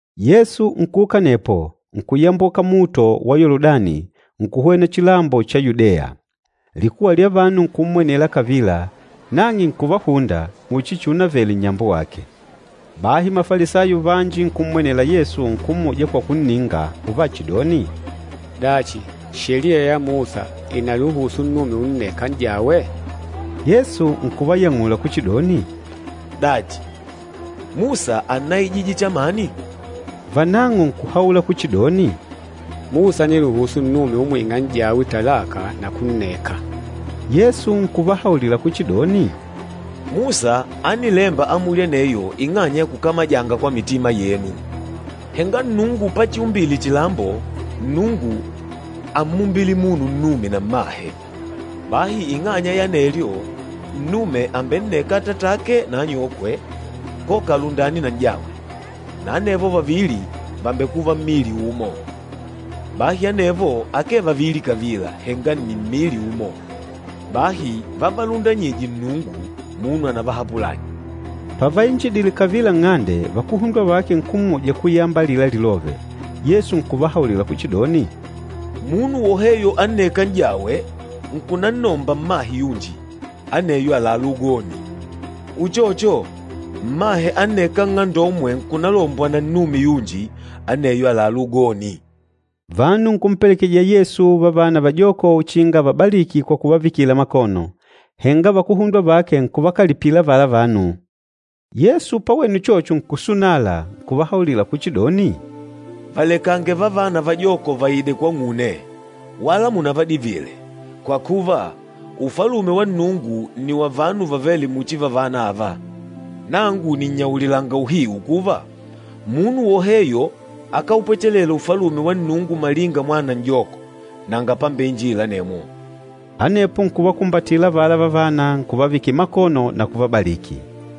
Yesu nkuuka anepo, nkuyamboka luhunde lwa Yoludani, nkuhwena chilambo cha Yudeya. Likuwa lya vanu nkummwenela kavila, nang'e nkuvahunda muchi chiunavele nnyambo wake. Bahi Mafalisayo vanji nkummwenela Yesu, nkummuja kwa kunninga uvachidoni, “Dachi, Sheliya ya Musa ìnaluhusu nnume unneka n'jawe?” Yesu nkuvayang'ula kuchidoni, “Dachi, Musa ánnaijije chamani?” Vanang'o nkuhaula kuchidoni, “Musa ániluhusu nnume umwing'a n'jawe talaka na kunneka.” Yesu nkuvahaulila kuchidoni, “Musa ánilemba amuli aneyo ing'anya ya kukamajanga kwa mitima yenu. Henga Nnungu pachiumbile chilambo, Nnungu ámmumbile munu nnume na mmahe. Bahi ing'anya ya anelyo, nnume àmbenneka atatake na anyokwe, koka alundane na n'jawe, na anevo vavili vàmbekuva mmili umo. Bahi anevo akee vavili kavila, henga nni mmili umo. Bahi vavalundanyîje Nnungu, munu anavahapulanye.” Pavainjidile kavila nng'ande, vakuhundwa vake nkummuja kuyamba alila lilove. Yesu nkuvahaulila kuchidoni, “Munu woheyo annêka n'jawe, nkunannomba mmahe yunji, aneyo àlalá ugoni. Uchocho, mmahe annêka nng'andomwe nkulombwa na nnume yunji, aneyo àlalá ugoni.” Vanu nkumpelekejija Yesu vavana vajoko uchinga avabaliki kwa kuvavikila makono, henga vakuhundwa vake nkuvakalipila avala vanu. Yesu pawene uchocho nkusunala, nkuvahaulila kuchidoni, “Valekange vavana vajoko vaide kwang'une, wala munavadivile, kwa kuva, Ufalume wa Nnungu nni wa vanu vavêle muchi vavana ava. Nangu nìnnyaulilanga uhiu kuva, munu woheyo akáupwechela Ufalume wa Nnungu malinga mwana n'joko, nanga pambeinjila anemwo.” Anepo nkuvakumbatila avala vavana, nkuvavikila makono na kuvabaliki.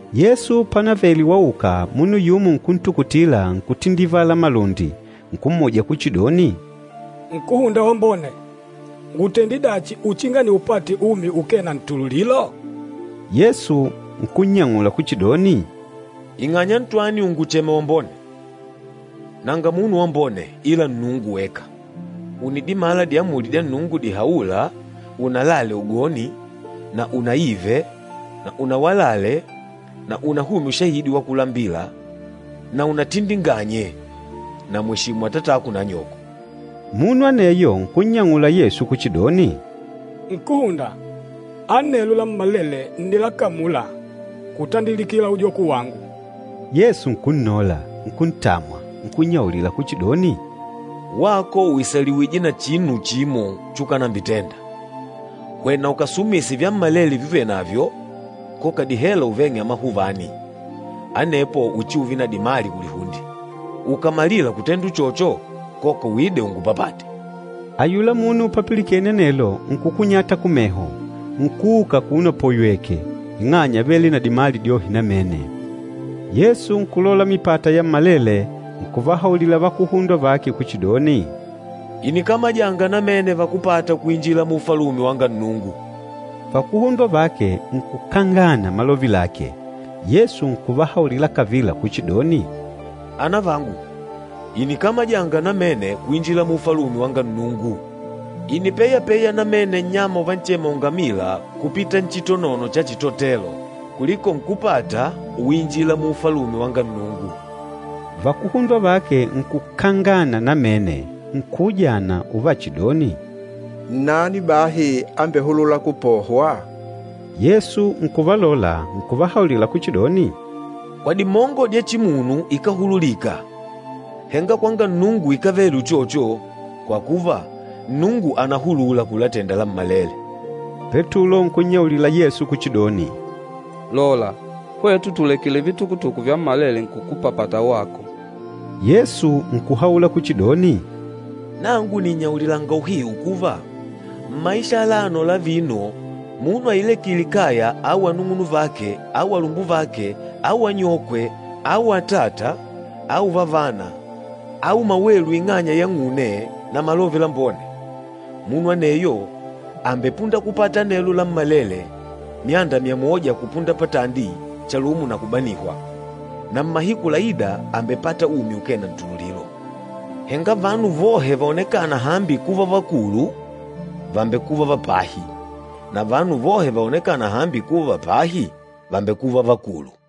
Yesu pánavele wauka, munu yumo nkuntukutila nkutindivala malundi, nkummuja kuchidoni, “Nkúhunda wambone, ngùtende dachi uchinga niupate umi ukee na ntululilo?” Yesu nkunnyang'ula kuchidoni, “Ing'anya ntwani ùnguchema wambone? Nanga munu wambone ila Nnungu weka. Ùnidimala diamuli dya Nnungu dihaûla, ‘Unalale ugoni na unaive na unawalale na unahumye ushahidi wa kulambila na unatindinganyange na mweshimu atatako na anyoko.’” Munu aneyo nkunnyang'ula Yesu kuchidoni, “Nkúhunda, anelo lammalele ǹnilakamula kutandilikila ujoko wangu.” Yesu nkunnola, nkuntamwa, nkunnyaulila kuchidoni, “Wako ùisaliwije na chinu chimo chukanambitenda. Hwena ukasumise vyammalele vyuvenavyo, koka dihela uveng'e amahuvani, anepo uchiuve na dimali kulihunde. Ukàmalila kutenda uchocho koka uide ungupapate.” Ayula munu papilikene anelo nkukunyata kumeho, nkuuka akuno apoywèkè, ing'anya ávele na dimali dyohe namene. Yesu nkulola mipata yammalele, nkuvahaulila vakuhundwa vake kuchidoni, “Ìnikamajanga namene vakúpata kuinjila mu Ufalume wanga Nnungu!” Vakuhundwa vake nkukangana malove lake. Yesu nkuvahaulila kavila kuchidoni, “Anavangu, ìnikamajanga namene kuinjila mu Ufalume wanga Nnungu! Ìnipeyapeya namene nnyama uvanchema ungamila kupita nchitonono cha chitotelo, kuliko nkúpata uinjila mu Ufalume wanga Nnungu.” Vakuhundwa vake nkukangana namene, nkuujana, uvachidoni, “Nnani bahi ambehulûla kupohwa?” Yesu nkuvalola nkuvahaulila kuchidoni, “Kwa dimongo dya chimunu ikáhululika, henga kwanga Nnungu ikávele uchocho, kwa kuva, Nnungu ànahulula kulatenda lammalele.” Petulo nkunnyaulila Yesu kuchidoni, “Lola, hwetu tùlekile vitukutuku vyammalele nkukupapata wako!” Yesu nkuhaula kuchidoni, “Nangu nìnnyaulilanga uhiu kuva, mmaisha alano la vino munu ailekîle kaya au anung'unuvake au alumbuvake au anyokwe au atata au vavana au mawelu ing'anya yang'une na Malove Lambone, munu aneyo àmbepunda kupata anelo lammalele myanda myamoja kupunda patandi chalumo na kubanihwa. Na mmahiku laîda àmbepata umi ukee na ntululilo. Henga vanu vohe vaonekâna hambi kuva vakulu, vàmbekuva va pahi, na vanu vohe vaonekâna hambi kuva va pahi, vàmbekuva vakulu.”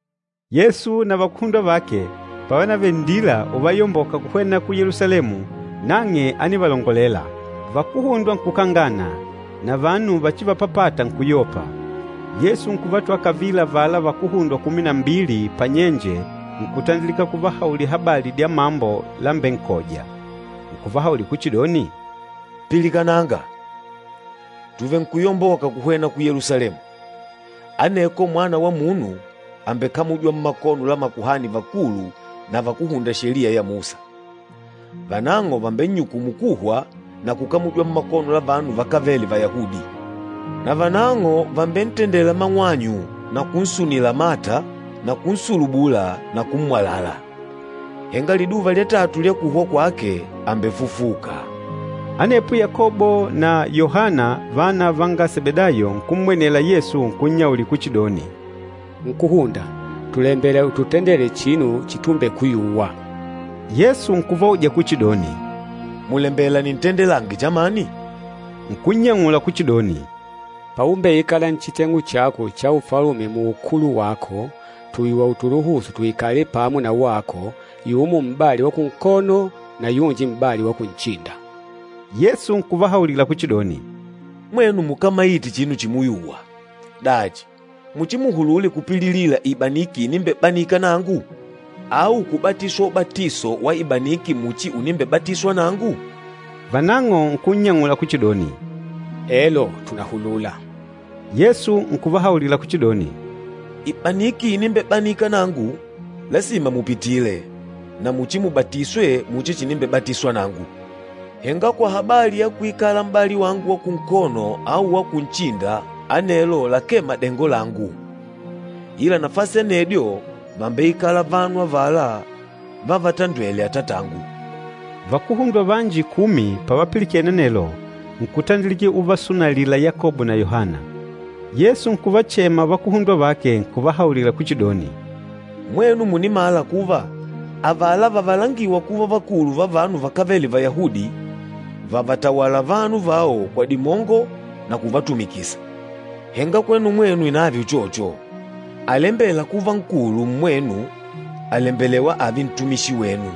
Yesu na vakuhundwa vake pávanavele nndila uvayomboka kuhwena ku Yelusalemu nang'e ánivalongolela. Vakuhundwa nkukangana na vanu vachivapapata nkuyopa. Yesu nkuvatwala kavila avala vakuhundwa kumi na mbili panyenje nkutandilika kuvahaulila habali dya mambo lámbenkòjà. Nkuvahaulila kuchidoni, “Pilikananga! Tùvenkuyomboka kuhwena ku Yelusalemu, aneko Mwana wa Munu, àmbekamujwa mmakono la makuhani vakulu na vakúhunda Sheliya ya Musa. Vanang'o vàmbennyukumu kuhwa na kukamujwa mmakono la vanu vakávele Vayahudi. Na vanang'o vàmbentendela mang'wanyu na kunsunila mata na kunsulubula na kummwalala. Henga liduva lya tatu lya kuhwa kwake àmbefufuka.” Anepo Yakobo na Yohana vana vanga Sebedayo, nkummwenela Yesu nkunnyaulila kuchidoni, “Nkúhunda, tùlembela ututendele chinu chitumbekuyuwa.” Yesu nkuvauja kuchidoni, “Mùlembela nintendelange chamani?” Nkunnyang'ula kuchidoni, “Paumbeikala nchiteng'u chako cha Ufalume muukulu wako, tuyuwa utuluhusu tuikale pamo na wako, yumo m'bali wa kunkono na yunji m'bali wa kunchinda.” Yesu nkuvahaulila kuchidoni, “Mwenu mukámaite chinu chimuyuwa! Dachi, muchimuhulule kupililila ibaniki inimbebanika nangu? Au kubatiswa ubatiso wa ibaniki muchi unimbebatiswa nangu?” Vanang'o nkunnyang'ula kuchidoni, “Elo, tùnahulula.” Yesu nkuvahaulila kuchidoni, “Ibaniki inimbebanika nangu, lasima mupitile, na muchimubatiswe muchi chinimbebatiswa nangu. Henga kwa habali ya kuikala m'bali wangu wa kunkono au wa kunchinda anelo lakee madengo langu. Ila nafasi anedyo vàmbeikala vanu avala vávatandwèlè Atatangu.” Vakuhundwa vanji kumi pavapilikene anelo, nkutandilika uvasunalila Yakobo na Yohana. Yesu nkuvachema vakuhundwa vake, nkuvahaulila kuchidoni, “Mwenu mùnimala kuva avala vavalangîwa kuva vakulu va vanu vakávele Vayahudi, vàvatawala vanu vao kwa dimongo na kuvatumikisa. Henga kwenu mwenu inave uchocho. Alembêla kuva nkulu mmwenu, àlembelewa ààve ntumishi wenu.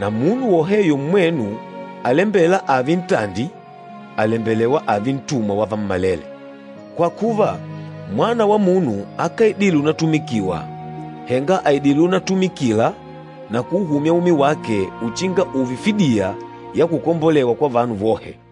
Na munu woheyo mmwenu alembêla ààve ntandi, àlembelewa ààve ntumwa wa vammalele. Kwa kuva, Mwana wa Munu akáidile unatumikiwa, henga àidile unatumikila na kuuhumya umi wake uchinga ùùve fidiya ya kukombolewa kwa vanu vohe.”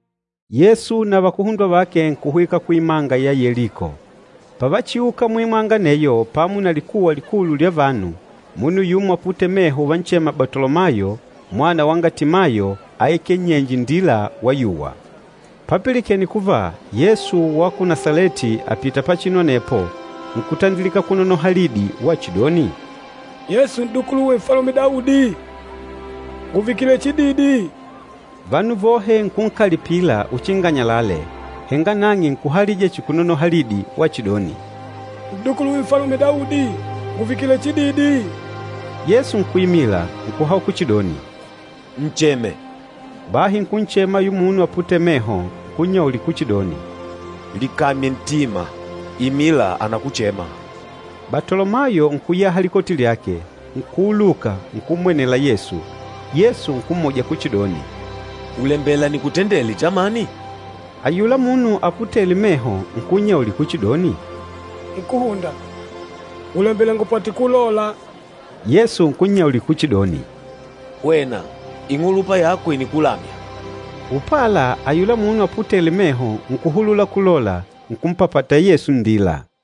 Yesu na vakuhundwa vake nkuhwika kuimanga ya Yeliko. Pavachiuka muimanga aneyo pamo na likuwa likulu lya vanu, munu yumo aputêle meho uvanchema Batolomayo mwana wanga Timayo áikele nnyenje indila wayuwa. Papilikene kuva Yesu wa ku Nasaleti àpita pachinu anepo nkutandilika kunonoha lidi wachidoni, “Yesu n'dukuluwe Nfalume Daudi, nguvikile chididi!” Vanu vohe nkunkalipila uchinga anyalale, henga nang'e nkuhalija chihi kunonoha lidi wachidoni, “N'dukuluwe Nfalume Daudi, nguvikile chididi!” Yesu nkuimila, nkuhaula kuchidoni, “Ncheme.” Bahi nkunchema ayula munu aputêle meho, nkunnyaulila kuchidoni, “Likamye ntima! Imila, anakuchema.” Batolomayo nkuyaha likoti lyake, nkuuluka, nkummwenela Yesu. Yesu nkummuja kuchidoni, “Ùlembela nikutendele chamani?” Ayula munu aputêle meho nkunnyaulila kuchidoni, “Nkúhunda, ngùlembela ngupate kulola.” Yesu nkunyaulila kuchidoni, “Hwena, ing'ulupa yako ìnikulamya.” Upala ayula munu aputêle meho, nkuhulula kulola, nkumpapata Yesu nndila.